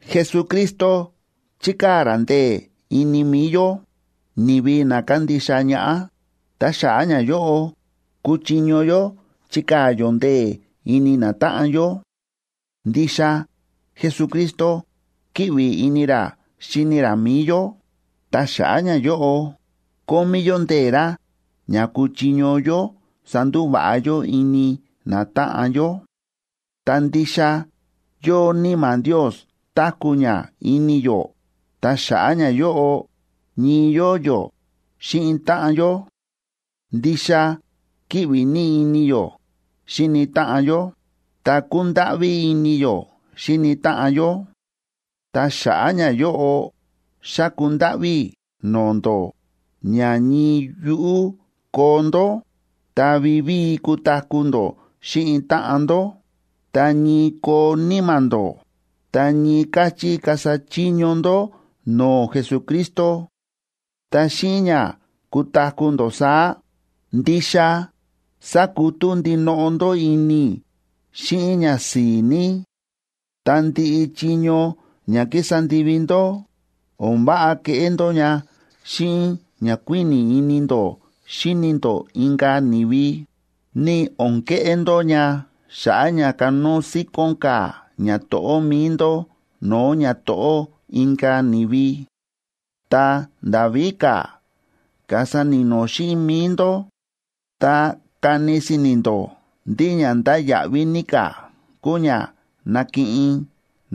Jesucristo chíkaa̱ ra ndee̱ ini mi̱i yó, ni̱vi na kándixa ñaꞌá, ta xa̱ꞌa̱ ñayóꞌo, kúchiño yó chikaa̱ yó ndee̱ ini natáꞌan yó. Ndixa Jesucristo kíꞌvi ini ra xíni ra mi̱i yó, ta xa̱ꞌa̱ ñayóꞌo, kómí yó ndee̱ ra ña kúchiño yó sandúva̱ꞌa yó ini natáꞌan yó. Ta ndixa yóo Níma̱ Ndios táku̱ ña ini yó, ta xa̱ꞌa̱ ñayóꞌo, ñii yóo yó xíꞌin táꞌan yó. Ndixa kíꞌvi ní ini yó xíni táꞌan yó, ta kúndáꞌví ini yó xíni táꞌan yó. Ta xa̱ꞌa̱ ñayóꞌo, xáku ndáꞌví i̱ no̱o̱ ndó ña ñii yuꞌú koo ndó, ta vivíi kutaku̱ ndó xíꞌin táꞌan ndó, ta ñii koo níma̱ ndó, ta ñii káchí kasa chiño ndó no̱o̱ Jesucristo. Ta xíꞌin ña kutaku̱ ndó saá, ndixa sakutú ndinoꞌo ndó ini i̱ xíꞌin ñasi̱i̱ ní. Ta ndiꞌi chiño ña kísa ndivi ndó, o̱n váꞌa keꞌé ndó ña xíꞌin ña kuíni̱ ini ndó xíni ndó inka̱ ni̱vi, ni o̱n keꞌé ndó ña xa̱ꞌa̱ ña kanóo síkón ka̱ ñato̱ꞌó mi̱i ndó no̱o̱ ñato̱ꞌó inka̱ ni̱vi. Ta nda̱ víka̱, kasa ni̱no̱ xíꞌin mi̱i ndó, ta kani si̱ni̱ ndó ndí ña ndáya̱ꞌví ní ka̱ kúu ña nakiꞌin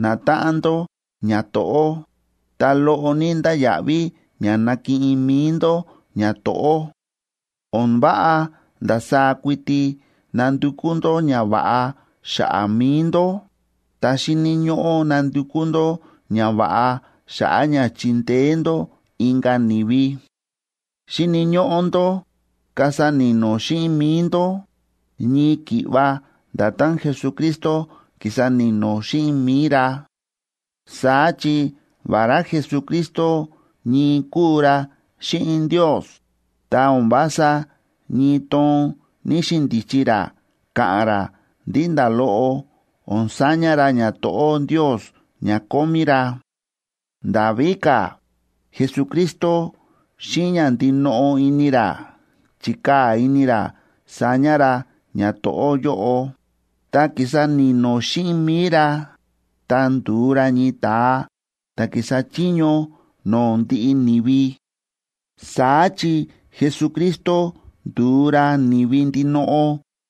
natáꞌan ndó ñato̱ꞌó, ta loꞌo ní ndáya̱ꞌví ña nakiꞌin mi̱i ndó ñato̱ꞌó. O̱n váꞌa ndasaá kuiti nandukú ndó ñava̱ꞌa xa̱ꞌa̱ mi̱i ndó, ta xíni̱ ñóꞌó nandukú ndó ñava̱ꞌa xa̱ꞌa̱ ña chindeé ndó inka̱ ni̱vi. Xíni̱ ñóꞌó ndó kasa ni̱no̱ xíꞌin mi̱i ndó, ñii ki̱ꞌva nda̱tán Jesucristo ki̱sa ni̱no̱ xíꞌin mi̱i ra. Saá chi vará Jesucristo ñii kúu ra xíꞌin Ndios, ta o̱n vása ñii toon ní‑xindichi ra káꞌán ra ndí nda̱ loꞌo o̱n saña ra ñato̱ꞌó Ndios ña kómí ra. Nda̱ víka̱, Jesucristo xíꞌin ña ndinoꞌo ini ra, chi̱kaa̱ ini ra saña ra ñato̱ꞌó yóꞌo, ta ki̱sa ni̱no̱ xíꞌin mi̱i ra, ta ndu̱u ra ñii ta̱a ta̱ kísa chiño no̱o̱ ndiꞌi ni̱vi. Saá chi Jesucristo ndu̱u ra ni̱vi ndinoꞌo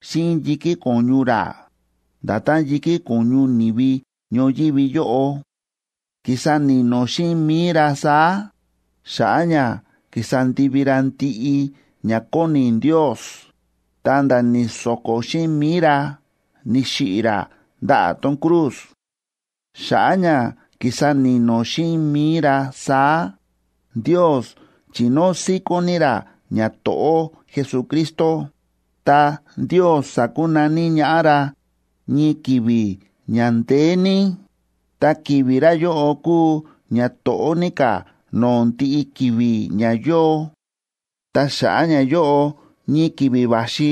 xíꞌin yi̱kí ko̱ñu ra, nda̱tán yi̱kí ko̱ñu ni̱vi ñoyívi yóꞌo. Ki̱sa ni̱no̱ xíꞌin mi̱i ra saá, xa̱ꞌa̱ ña ki̱sa ndivi ra ndiꞌi ña kóni Ndios, ta̱nda̱ ni̱so̱ko̱ xíꞌin mi̱i ra, ni̱xiꞌi̱ ra ndaꞌa̱ tón cruz. Xa̱ꞌa̱ ña ki̱sa ni̱no̱ xíꞌin mi̱i ra saá, Ndios chi̱nóo síkón ní ra ñato̱ꞌó Jesucristo, ta Ndios sa̱kunaní ñaꞌá ra ñii ki̱vi̱ ña ndeé ní, ta ki̱vi̱ ra yóꞌo kúu ña to̱ꞌó ní ka̱ no̱o̱ ndiꞌi ki̱vi̱ ña yóo. Ta xa̱ꞌa̱ ñayóꞌo, ñii ki̱vi̱ va̱xi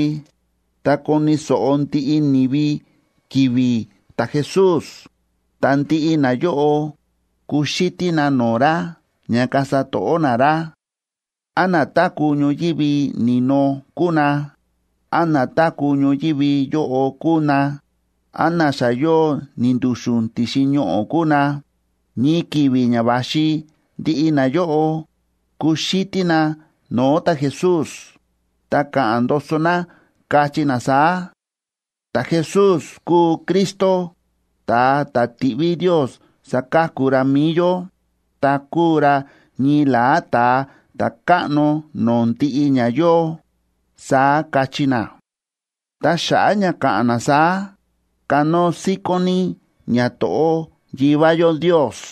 tá koni̱ so̱ꞌo ndiꞌi ni̱vi ki̱vi̱ ta̱Jesús, ta ndiꞌi nayóꞌo kuxítí na no̱o̱ ra ña kasa to̱ꞌó na ra. Án na táku̱ ñoyívi ni̱no kúu na, án na táku̱ ñoyívi yóꞌo kúu na, án na xa yóo ni̱ndu̱xu̱n ti̱xin ñoꞌo̱ kúu na, ñii ki̱vi̱ ña va̱xi ndiꞌi nayóꞌo, kuxítí na no̱o̱ ta̱Jesús, ta ka̱ꞌa̱n ndoso na, kachí na saá: “Ta̱Jesús kúu Cristo, ta̱a ta̱ ti̱ꞌví Ndios saka̱ku ra mi̱i yó, ta kúu ra ñii la̱á Ta̱a Ta̱káꞌno no̱o̱ ndiꞌi ña yóo”, saá kachí na. Ta xa̱ꞌa̱ ña ka̱ꞌa̱n na saá, kanóo síkón ní ñato̱ꞌó Yivá yó Ndios.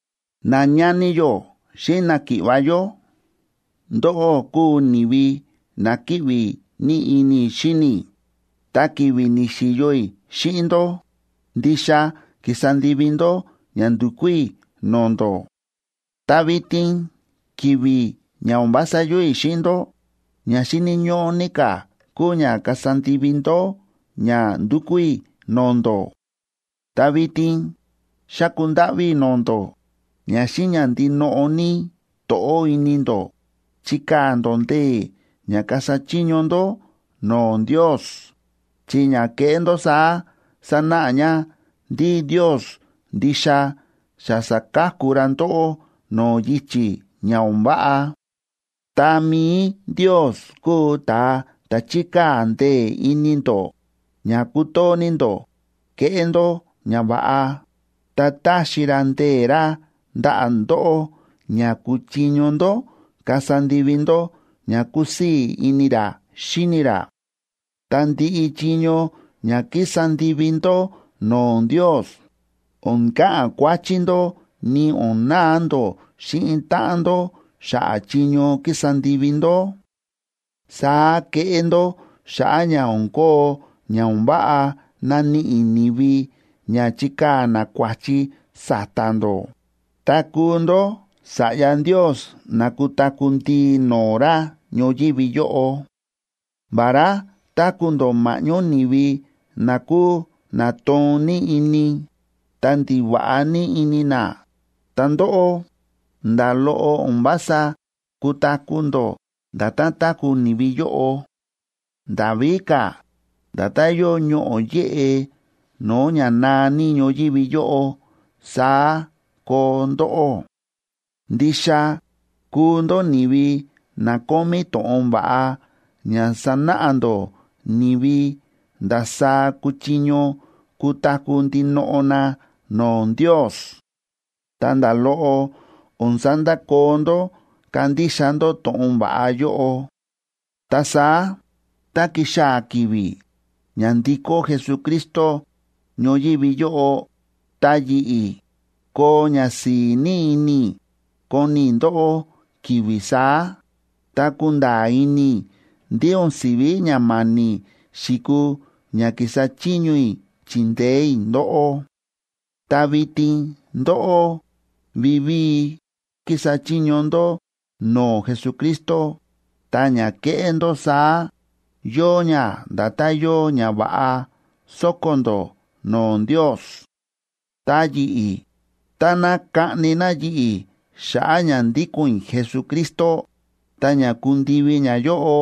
Nañani yó xíꞌin náki̱ꞌva̱ yó, ndóꞌó kúu ni̱vi na kíꞌvi ní ini i̱ xíni i̱, ta ki̱vi̱ ni̱xi̱yo i̱ xíꞌin ndó, ndixa ki̱sa ndivi ndó ña ndu̱kú i̱ no̱o̱ ndó. Ta vitin ki̱vi̱ ña o̱n vása yóo i̱ xíꞌin ndó, ña xíni̱ ñóꞌó ní ka̱ kúu ña kasa ndivi ndó ña ndúkú i̱ no̱o̱ ndó. Ta vitin xáku ndáꞌví i̱ no̱o̱ ndó ña xíꞌin ña ndinoꞌo ní to̱ꞌó ini ndó chikaa̱ ndó ndee̱ ña kasa chiño ndó no̱o̱ Ndios, chi ña keꞌé ndó saá sanáꞌa ña ndí Ndios ndixa xa sa̱ka̱ku ra ndóꞌó no̱o̱ yichi̱ ña o̱n váꞌa. Ta mi̱i Ndios kúu ta̱a ta̱ chíkaa̱ ndee̱ ini ndó ña kutoo ní ndó keꞌé ndó ñava̱ꞌa, ta táxi ra ndee̱ ra ndaꞌa̱ ndóꞌó ña kuchiño ndó kasa ndivi ndó ña kúsii̱ ini ra xíni ra. Ta ndiꞌi chiño ña kísa ndivi ndó no̱o̱ Ndios, o̱n ka̱ꞌa̱n kuáchí ndó, ni o̱n na̱a ndó xíꞌin táꞌan ndó xa̱ꞌa̱ chiño kísa ndivi ndó. Saá keꞌé ndó xa̱ꞌa̱ ña o̱n kóo ña o̱n váꞌa naníꞌi ni̱vi ña chikaa̱ na kua̱chi sa̱ta̱ ndó, ta kuu ndó sa̱ꞌya Ndios na kutaku̱ ndii no̱o̱ ra ñoyívi yóꞌo. Vará táku̱ ndó ma̱ꞌñó ni̱vi na kúu na toon ní ini, ta ndiva̱ꞌa ní ini na, ta ndóꞌó, nda̱ loꞌo o̱n vása kutaku̱ ndó nda̱tán táku̱ ni̱vi yóꞌo. Nda̱ víka̱, nda̱tán yóo ñoꞌo̱ yéꞌe no̱o̱ ña naa ní ñoyívi yóꞌo, saá koo ndóꞌó. Ndixa kúu ndó ni̱vi na kómí to̱ꞌon va̱ꞌa ña sánáꞌa ndó ni̱vi ndasaá kúchiño kutaku̱ ndinoꞌo na no̱o̱ Ndios. Ta nda̱ loꞌo o̱n sandakoo ndó kándixa ndó to̱ꞌon va̱ꞌa yóꞌo. Ta saá, tá kixaa̱ ki̱vi̱ ña ndikó Jesucristo ñoyívi yóꞌo, ta yi̱ꞌi̱, koo ñasi̱i̱ ní ini i̱ koni i̱ ndóꞌó ki̱vi̱ saá, ta kunda̱a̱ ini i̱ ndí o̱n si̱ví ña ma̱ni̱ xi̱kuu ña ki̱sa chiño i̱ chi̱ndeé i̱ ndóꞌó. Ta vitin ndóꞌó vivíi kísa chiño ndó no̱o̱ Jesucristo, ta ña kéꞌé ndó saá yóo ña nda̱tán yóo ñava̱ꞌa sóko̱ ndó no̱o̱ Ndios. Ta yi̱ꞌi̱, táná kaꞌni na yi̱ꞌi̱ xa̱ꞌa̱ ña ndíko̱n i̱ Jesucristo, ta ña kundivi ñayóꞌo,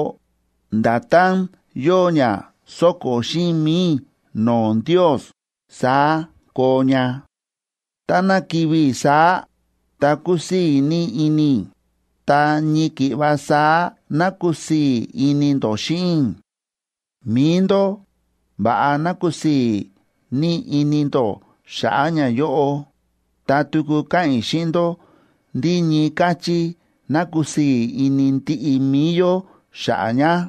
nda̱tán yóo ña so̱ko̱ xíꞌin mi̱i i̱ no̱o̱ Ndios, saá koo ña.a Ta táná kivi̱ i̱ saá, ta kusii̱ ní ini i̱ ta ñii ki̱ꞌva saá ná kusii̱ ini ndó xíꞌin i̱. Mi̱i ndó, va̱ꞌa ná kusii̱ ní ini ndó xa̱ꞌa̱ ñayóꞌo, ta tuku káꞌa̱n i̱ xíꞌin ndó ndí ñii káchí ná kusii̱ ini ndiꞌi mi̱i yó xa̱ꞌa̱ ña.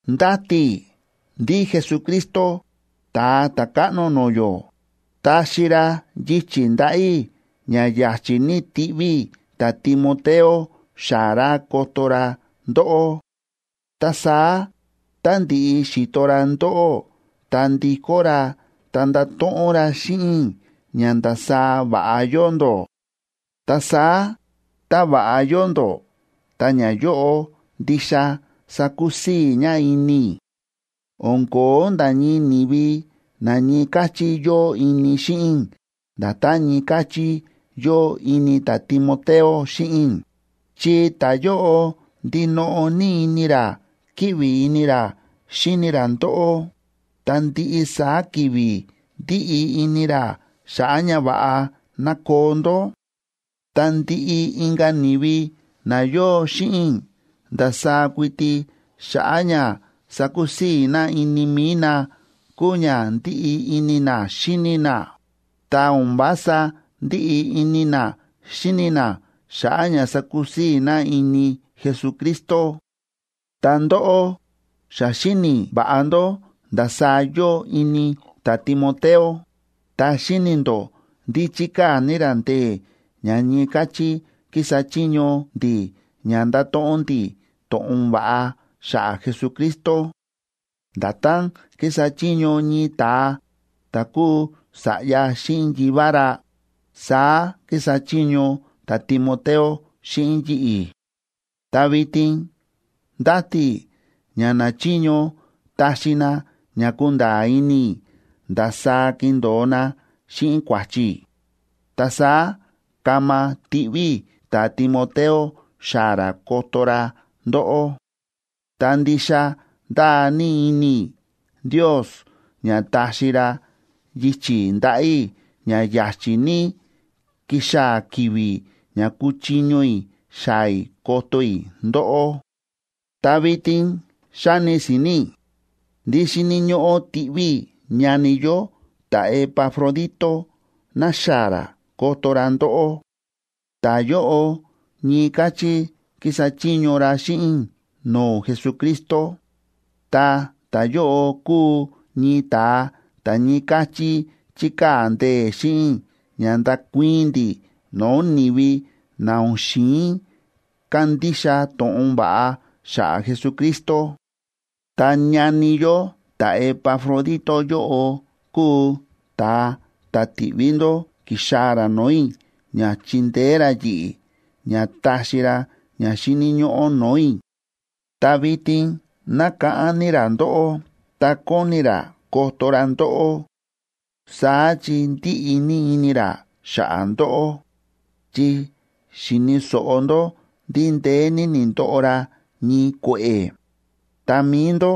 Ndáti i̱ ndí Jesucristo, Ta̱a Ta̱káꞌno no̱o̱ yó, taxi ra yichi̱ ndaꞌa̱ i̱ ña ya̱chi̱ ní tiꞌví i̱ ta̱Timoteo xaa̱ ra koto ra ndóꞌó. Ta saá tá ndi̱ꞌi xi̱to ra ndóꞌó ta ndi̱kó ra, ta ndato̱ꞌon ra xíꞌin i̱ ña ndasaá va̱ꞌa yóo ndó. Ta saá tá va̱ꞌa yóo ndó, ta ñayóꞌo ndixa sakusii̱ ña ini i̱. O̱n ko̱ó nda̱ ñii ni̱vi na ñii káchí yóo ini xíꞌin i̱ nda̱tán ñii káchí yóo ini ta̱Timoteo xíꞌin i̱, chi ta̱yóꞌo ndinoꞌo ní ini ra kíꞌvi ini ra xíni ra ndóꞌó ta ndiꞌi saá ki̱vi̱ ndíꞌi ini ra xa̱ꞌa̱ ña va̱ꞌa ná koo ndó. Ta ndiꞌi inka̱ ni̱vi na yóo xíꞌin i̱ ndasaá kuiti xa̱ꞌa̱ ña sakusii̱ na ini mi̱i na kúu ña ndíꞌi ini na xíni na, ta o̱n vása ndíꞌi ini na xíni na xa̱ꞌa̱ ña sakusii̱ na ini Jesucristo. Ta ndóꞌó xa xíni̱ va̱ꞌa ndó ndasaá yóo ini ta̱Timoteo, ta xíni̱ ndó ndí chíkaa̱ ní ra ndee̱ ña ñii káchí kísa chiño ndi̱ ña ndáto̱ꞌon ndi̱ to̱ꞌon va̱ꞌa xa̱ꞌa̱ Jesucristo. Nda̱tán kísa chiño ñii ta̱a ta̱ kúu sa̱ꞌya xíꞌin yivá ra, saá kísa chiño ta̱Timoteo xíꞌin yi̱ꞌi̱. Ta vitin ndáti i̱ ña nachiño taxi na ña kunda̱a̱ ini i̱ ndasaá kindo̱o na xíꞌin kua̱chi i̱, ta saá kama tiꞌví i̱ ta̱Timoteo xaa̱ ra koto ra ndóꞌó. Ta ndixa ndáa ní ini i̱ Ndios ña taxi ra yichi̱ ndaꞌa̱ i̱ ña ya̱chi̱ ní kixaa̱ ki̱vi̱ ña kuchiño i̱ xaa̱ i̱ koto i̱ ndóꞌó. Ta vitin xáni si̱ni̱ i̱ ndí xíni̱ ñóꞌó tiꞌví i̱ ñani yó ta̱Epafrodito naxaa̱ ra koto ra ndóꞌó. Ta̱yóꞌo ñii káchí kísa chiño ra xíꞌin i̱ no̱o̱ Jesucristo, ta ta̱yóꞌo kúu ñii ta̱a ta̱ ñii káchí chíkaa̱ ndee̱ xíꞌin i̱ ña ndakuii̱n ndi̱ no̱o̱ ni̱vi na o̱n xi̱in kandixa to̱ꞌon va̱ꞌa xa̱ꞌa̱ Jesucristo. Ta ñani yó ta̱Epafrodito yóꞌo kúu ta̱a ta̱ ti̱ꞌví ndó ki̱xaa̱ ra no̱o̱ i̱ ña chindeé ra yi̱ꞌi̱ ña taxi ra ña xíni̱ ñóꞌó no̱o̱ i̱. Ta vitin nákáꞌán ní ra ndóꞌó, ta kóni ra koto ra ndóꞌó. Saá chi ndíꞌi ní ini ra xa̱ꞌa̱ ndóꞌó, chi xi̱ni̱ so̱ꞌo ndó ndí ndeé ní ni̱ndoꞌo ra ñii kue̱ꞌe̱, ta mi̱i ndó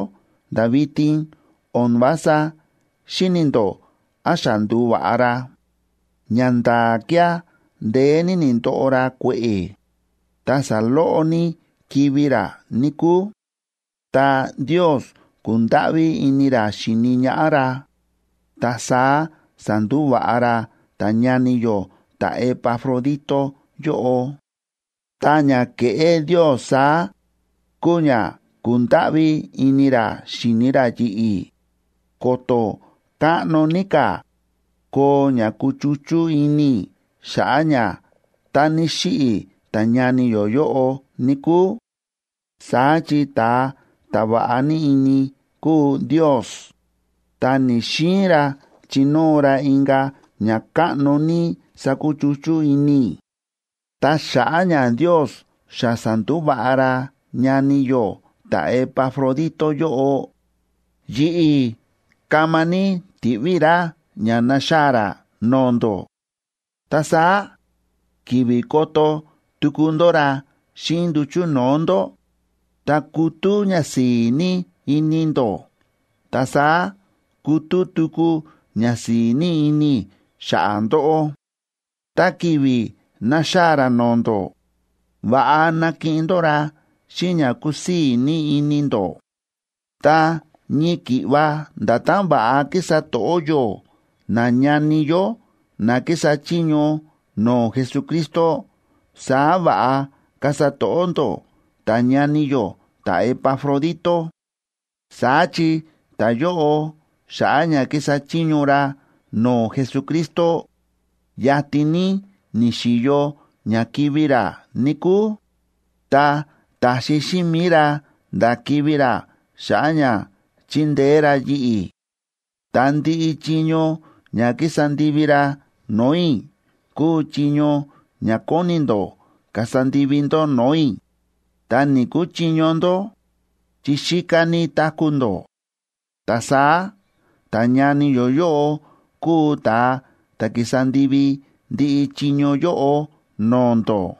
nda̱ vitin o̱n vása xíni̱ ndó án xa ndu̱va̱ꞌa ra. Ñanda̱a̱ kía̱ ndeé ní ni̱ndoꞌo ra kue̱ꞌe̱, ta saloꞌo ní kivi̱ ra, níkúu. Ta Ndios ku̱ndáꞌví ini ra xi̱ni ñaꞌá ra, ta saá sa̱ndúva̱ꞌa ra ta̱ñani yó ta̱Epafrodito yóꞌo. Ta ña ke̱ꞌé Ndios saá, kúu ña ku̱ndáꞌví ini ra xi̱ni ra yi̱ꞌi̱, ko̱to̱ káꞌno ní ka̱ koo ña kuchuchú ini i̱ xa̱ꞌa̱ ña tá ni̱xiꞌi̱ ta̱ñani yó yóꞌo, níkúu. Saá chi ta̱a ta̱ va̱ꞌa ní ini kúu Ndios, ta ni̱‑xiin ra chinóo ra inka̱ ñakáꞌno ní sakuchuchú ini i̱. Ta xa̱ꞌa̱ ña Ndios xa sa̱ndúva̱ꞌa ra ñani yó ta̱Epafrodito yóꞌo, yi̱ꞌi̱ kama ní tiꞌví i̱ ra ña naxaa̱ ra no̱o̱ ndó. Ta saá ki̱vi̱ koto tuku ndó ra xíꞌin nduchu̱ no̱o̱ ndó, ta kutú ñasi̱i̱ ní ini ndó, ta saá kutú tuku ñasi̱i̱ ní ini i̱ xa̱ꞌa̱ ndóꞌó. Tá ki̱vi̱ naxaa̱ ra no̱o̱ ndó, va̱ꞌa nakiꞌin ndó ra xíꞌin ña kúsii̱ ní ini ndó. Ta ñii ki̱ꞌva nda̱tán va̱ꞌa kísa to̱ꞌó yó nañani yó na kísa chiño no̱o̱ Jesucristo, saá va̱ꞌa kasa to̱ꞌó ndó ta̱ñani yó ta̱Epafrodito. Saá chi ta̱yóꞌo, xa̱ꞌa̱ ña kísa chiño ra no̱o̱ Jesucristo, yatin ní ni̱xi̱yo ña kivi̱ ra, níkúu, ta ta̱xi xíꞌin mi̱i ra nda̱ kivi̱ ra xa̱ꞌa̱ ña chindeé ra yi̱ꞌi̱. Ta ndiꞌi chiño ña ki̱sa ndivi ra no̱o̱ i̱ kúu chiño ña kóni ndó kasa ndivi ndó no̱o̱ i̱, ta ni̱‑kuchiño ndó, chi xíká ní táku̱ ndó. Ta saá ta̱ñani yó yóꞌo kúu ta̱a ta̱ ki̱sa ndivi ndiꞌi chiño yóꞌo no̱o̱ ndó.